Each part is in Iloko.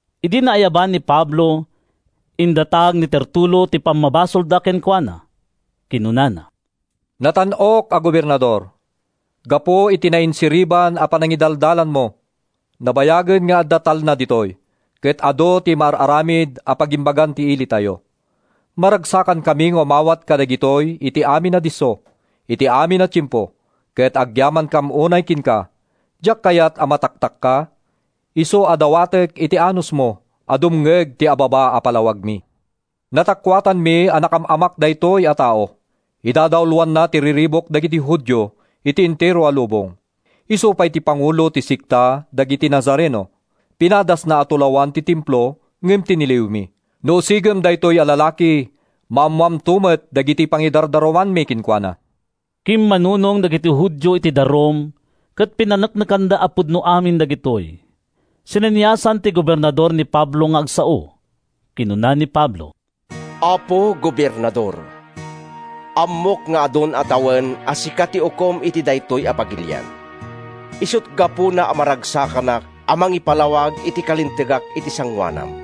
Idi naayaban ni Pablo, indatag ni Tertulo ti pammabasolda kenkuana. Kinunana: “Natan-ok a Gobernador! Gapu iti nainsiriban a panangidalanmo, nabayagen nga adda talna ditoy, ket adu ti maar-aramid a pagimbagan ti ilitayo. Maragsakankami nga umawat kadagitoy iti amin a disso, iti amin a tiempo, ket agyamankam unay kenka. Diak kayat a mataktakka, isu a dawatek ti anusmo a dumngeg iti ababa a palawagmi. Natakuatanmi a nakaam-amak daytoy a tao. Idadauloanna ti riribuk kadagiti Judio iti entero a lubong. Isu pay ti pangulo ti sekta dagiti Nazareno. Pinadasna a tulawan ti Templo ngem tiniliwmi. No usigem daytoy a lalaki, maammoamto met dagiti pangidardarumanmi kenkuana.” Kimmanunong dagiti Judio iti darum ket pinaneknekanda a pudno amin dagitoy. Sineniasan ti gobernador ni Pablo nga agsao. Kinuna ni Pablo: “Apo Gobernador, ammok nga adun a tawen a sika ti ukom iti daytoy a pagilian. Isut’ gapuna a maragsakanak a mangipalawag iti kalintegak iti sangoanam.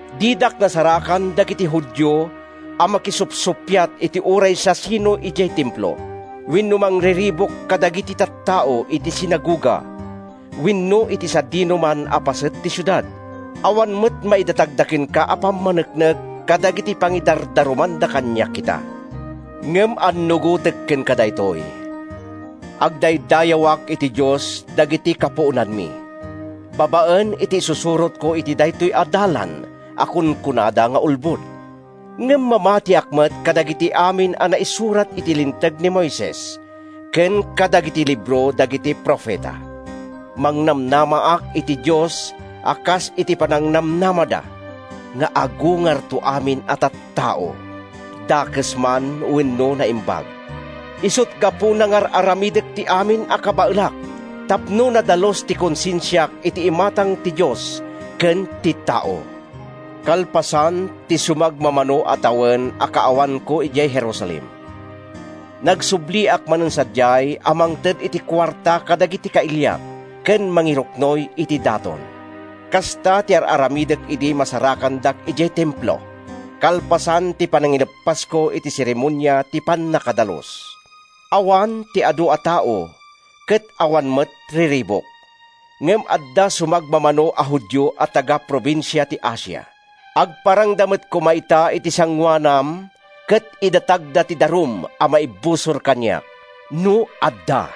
Didak nasarakan dagiti Judio a makisupsuppiat iti uray siasinoman idiay Templo, wenno mangriribuk kadagiti tattao iti sinagoga wenno iti sadinoman a paset ti siudad. Awan met maidatagda kenka a pammaneknek kadagiti pangidardarumanda kaniak ita. Ngem annugotek kenka daytoy: Agdaydayawak iti Dios dagiti kapuonanmi babaen iti isusurotko iti daytoy a Dalan a kunkunada nga ulbod. Ngem mamatiak met kadagiti amin a naisurat iti Linteg ni Moises ken kadagiti libro dagiti profeta. Mangnamnamaak iti Dios a kas iti panangnamnamada, nga agungarto amin a tattao, dakes man wenno naimbag. Isut’ gapuna nga ar-aramidek ti amin a kabaelak tapno nadalus ti konsensiak iti imatang ti Dios ken ti tao. “Kalpasan ti sumagmamano a tawen a kaawanko idiay Jerusalem, nagsubliak manen sadiay a mangted iti kuarta kadagiti kailiak ken mangiruknoy iti daton. Kasta ti ar-aramidek idi masarakandak idiay Templo, kalpasan ti panangileppasko iti seremonia ti pannakadalus. Awan ti adu a tao, ket awan met riribuk. Ngem adda sumagmamano a Judio a taga-probinsia ti Asia. Agparangda met koma ita iti sangoanam ket idatagda ti darum a maibusor kaniak, no adda.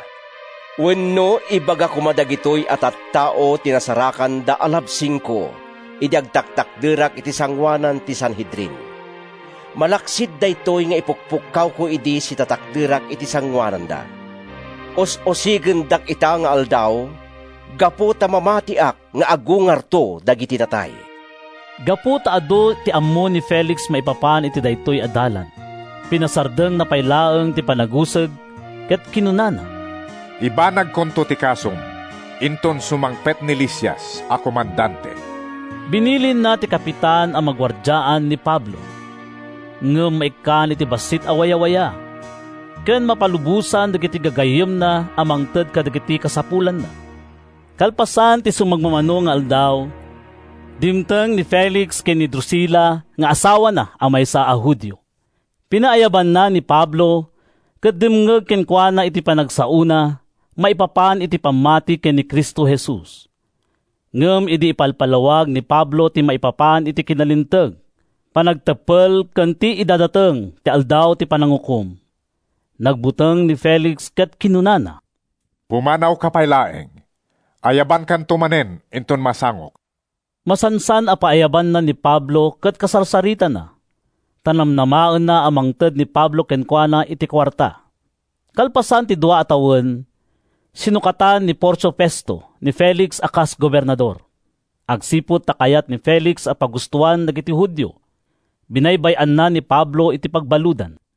Wenno, ibaga koma dagitoy a tattao ti nasarakanda a labsingko idi agtakderak iti sangoanan ti Sanhedrin, malaksid daytoy nga ipukkawko idi sitatakderak iti sangoananda: ‘Us-usigendak ita nga aldaw, gapu ta mamatiak nga agungarto dagiti natay.’” Gapu ta adu ti ammo ni Felix maipapan iti daytoy a Dalan, pinasardengna pay laeng ti panagusig ket kinunana, “Ibanagkonto ti kasom inton sumangpet ni Lisias a komandante.” Binilinna ti kapitan a maguardiaan ni Pablo, ngem maikkan iti bassit a wayawaya, ken mapalubosan dagiti gagayyemna a mangted kadagiti kasapulanna. Kalpasan ti sumagmamano nga aldaw, dimteng ni Felix ken ni Drusila nga asawana a maysa a Judio. Pinaayabanna ni Pablo ket dimngeg kenkuana iti panagsaona maipapan iti pammati ken ni Cristo Jesus. Ngem idi ipalpalawag ni Pablo ti maipapan iti kinalinteg, panagteppel ken ti idadateng ti Aldaw ti Panangukom, nagbuteng ni Felix ket kinunana, “Pumanawka pay laeng. Ayabankanto manen inton masangok.” Masansan a paayabanna ni Pablo ket kasarsaritana, ta namnamaenna a mangted ni Pablo kenkuana iti kuarta. Kalpasan ti dua a tawen, sinukatan ni Porcio Festo ni Felix a kas gobernador. Agsipud ta kayat ni Felix a pagustoan dagiti Judio, binaybay-anna ni Pablo iti pagbaludan.